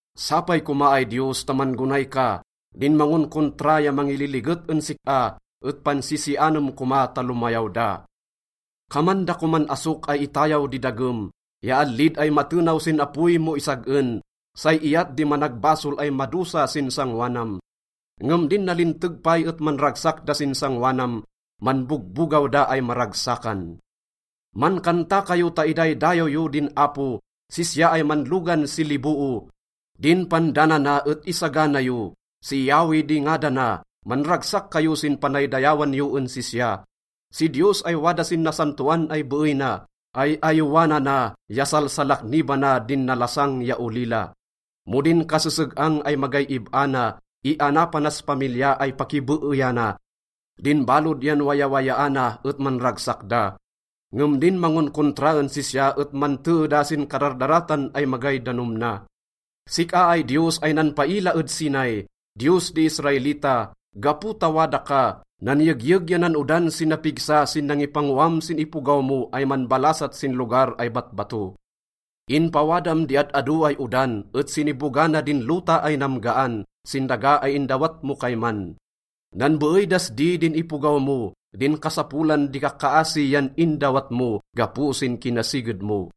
Sapay koma ay Diyos ta man-gonay ka, din mangonkontra ya mangililiget en sik-a et pansisianem koma ta lomayaw da. Kaman da koman asok ay itayaw di dagem ya allid ay matenaw sin apoy mo isag-en, say iyat di managbasol ay madosa sin sangoanam. Ngem din nalinteg pay et manragsak da sin sangoanam, manbogbogaw da ay maragsakan. Mankanta kayo ta idaydayaw yo din Apo, sisya ay manlogan si liboo, din pandanana et isagana yo. Si Yahweh di ngadana, manragsak kayo sin panaydayawan yo en sisya. Si Diyos ay wada sin nasantoan ay beey na, ay-ayowanana ya salsalaknibana din nalasang ya olila. Mo din kaseseg-ang ay magay ib-a na, ianapanas pamilya ay pakibeeyana, din balod yan wayawayaana et manragsak da. Ngem din mangonkontra en sisya et mantee da sin kadardaratan ay magay danom na. Sik-a ay Diyos ay nanpaila ed Sinai, Diyos di Israelita, gapo ta wada ka, nanyegyeg ya nan-odan si napigsa sin nangipangoam sin ipogaw mo ay manbalasat sin lugar ay batbato. Inpawadam di ad-ado ay odan et sinibogana din lota ay namgaan sin daga ay indawat mo kayman. Nanbeey das di din ipogaw mo, din kasapolan di kakkaasi yan indawat mo gapo sin kinasiged mo.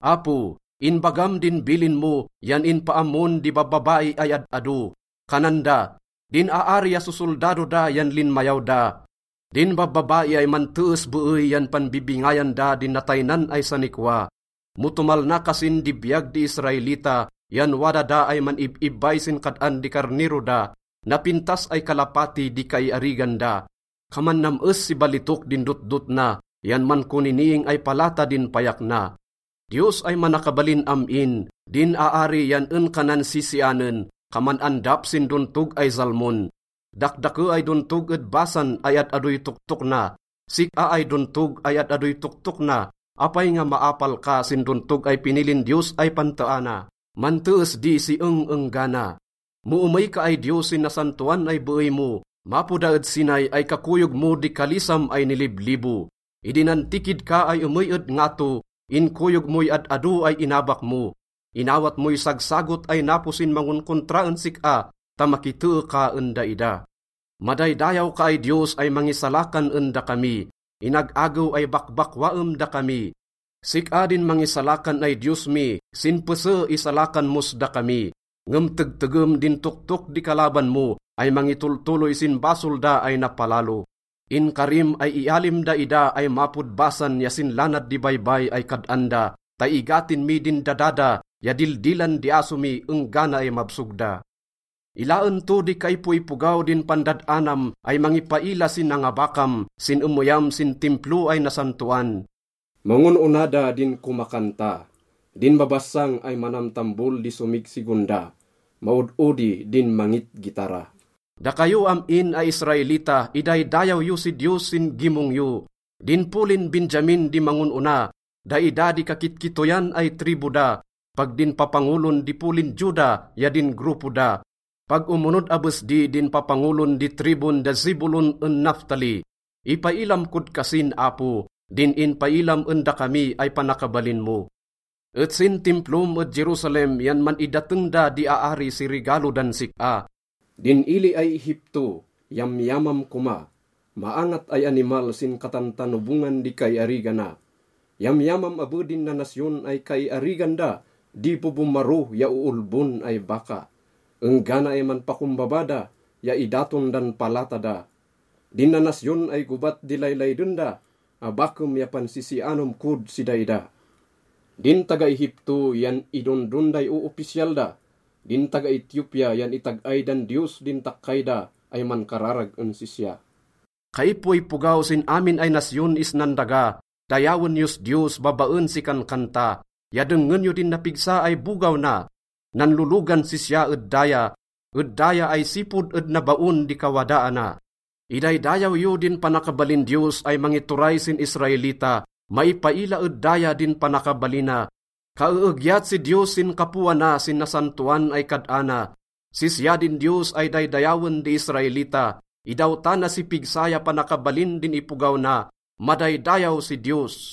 Apo, inbagam din bilin mo yan inpaammon di babbabai ay ad-ado. Kanan da, “Din aari ya sosoldado da yan linmayaw da!” Din babbabai ay mantees beey yan panbibingayan da din nataynan ay sanikwa. Mo tomalna kasin di biyag di Israelita yan wada da ay man-ib-ibbay sin kad-an di karnero da, napintas ay kalapati di kaiarigan da, kaman nam-es si balitok din dotdot na ya mankoniniing ay palata din payak na. Diyos ay Manakabalin Am-in, din aari yan en ka nansisianen, kaman andap sin dontog ay Zalmon. Dakdake ay dontog ed Basan ay ad-adoy toktok na. Sik-a ay dontog ay ad-adoy toktok na, apay nga maapal ka sin dontog ay pinilin Diyos ay panteana? Mantees di si eng-enggana. Mo emey ka ay Diyos sin nasantoan ay beey mo, mapo da ed Sinai ay kakoyog mo di kalisam ay niliblibo. Idi nantikid ka ay emey ed ngato, inkoyog moy ad-ado ay inabak mo. Inawat moy sagsagot ay napo sin mangonkontra en sik-a ta makitee ka en daida. Madaydayaw ka ay Diyos ay mangisalakan en dakami, inag-agew ay bakbakwaem dakami. Sik-a din mangisalakan ay Diyos mi, sin pese, isalakan mos dakami. Ngem tegtegem din toktok di kalaban mo ay mangitoltoloy sin basol da ay napalalo. Inkarim ay ialim daida ay mapod Basan ya sin lanad di baybay ay kad-an da, ta igatin mi din dada da ya dildilan di aso mi enggana ay mabsog da. Ilaen to di kaipoipogaw din pandad-anam ay mangipaila si nangabakam sin emeyam sin Timplo ay nasantoan. Mangon-ona da din komakanta, din babassang ay manamtambol di somigsigonda, maod-odi din mangitgitara. Dakayo am-in ay Israelita, idaydayaw yo si Diyos sin gimong yo. Din polin Benjamin di mangon-ona, daida di kakitkittoyan ay tribu da, pag din papangolon di polin Juda ya din grupo da. Pag omonod abes di din papangolon di tribun da Zebulun en Naftali. Ipailam kod kasin, Apo, din inpailam en dakami ay panakabalin mo. Et sin Timplom ed Jerusalem yan man-idateng da di aari si regalo dan sik-a. Din ili ay Egipto, yamyamam koma, maangat ay animal sin katantanobongan di kaiarigana. Yamyamam abe din nanasyon ay kaiarigan da di bobomaro ya oolbon ay baka, enggana ay manpakombaba da ya idaton dan palata da. Din nanasyon ay gobat di laylayden da, abakem ya pansisianem kod si daida. Din taga-Egipto yan idondon day oopisyal da, din taga-Etiopia yan itag-ay dan Diyos din takkay da ay mankararag en sisya. Kaipoipogaw sin amin ay nasyon isnan daga, dayawen yos Diyos babaen si kankanta, ya dengngen yo din napigsa ay bogaw na. Nanlologan sisya ed daya, ed daya ay sipod ed nabaon di kawadaana. Idaydayaw yo din panakabalin Diyos ay mangituray sin Israelita, maipaila ed daya din panakabalina. Kaeegyat si Diyos sin kapoana sin nasantoan ay kad-ana. Sisya din Diyos ay daydayawen di Israelita, idawtana si pigsa ya panakabalin din ipogaw na. Madaydayaw si Diyos!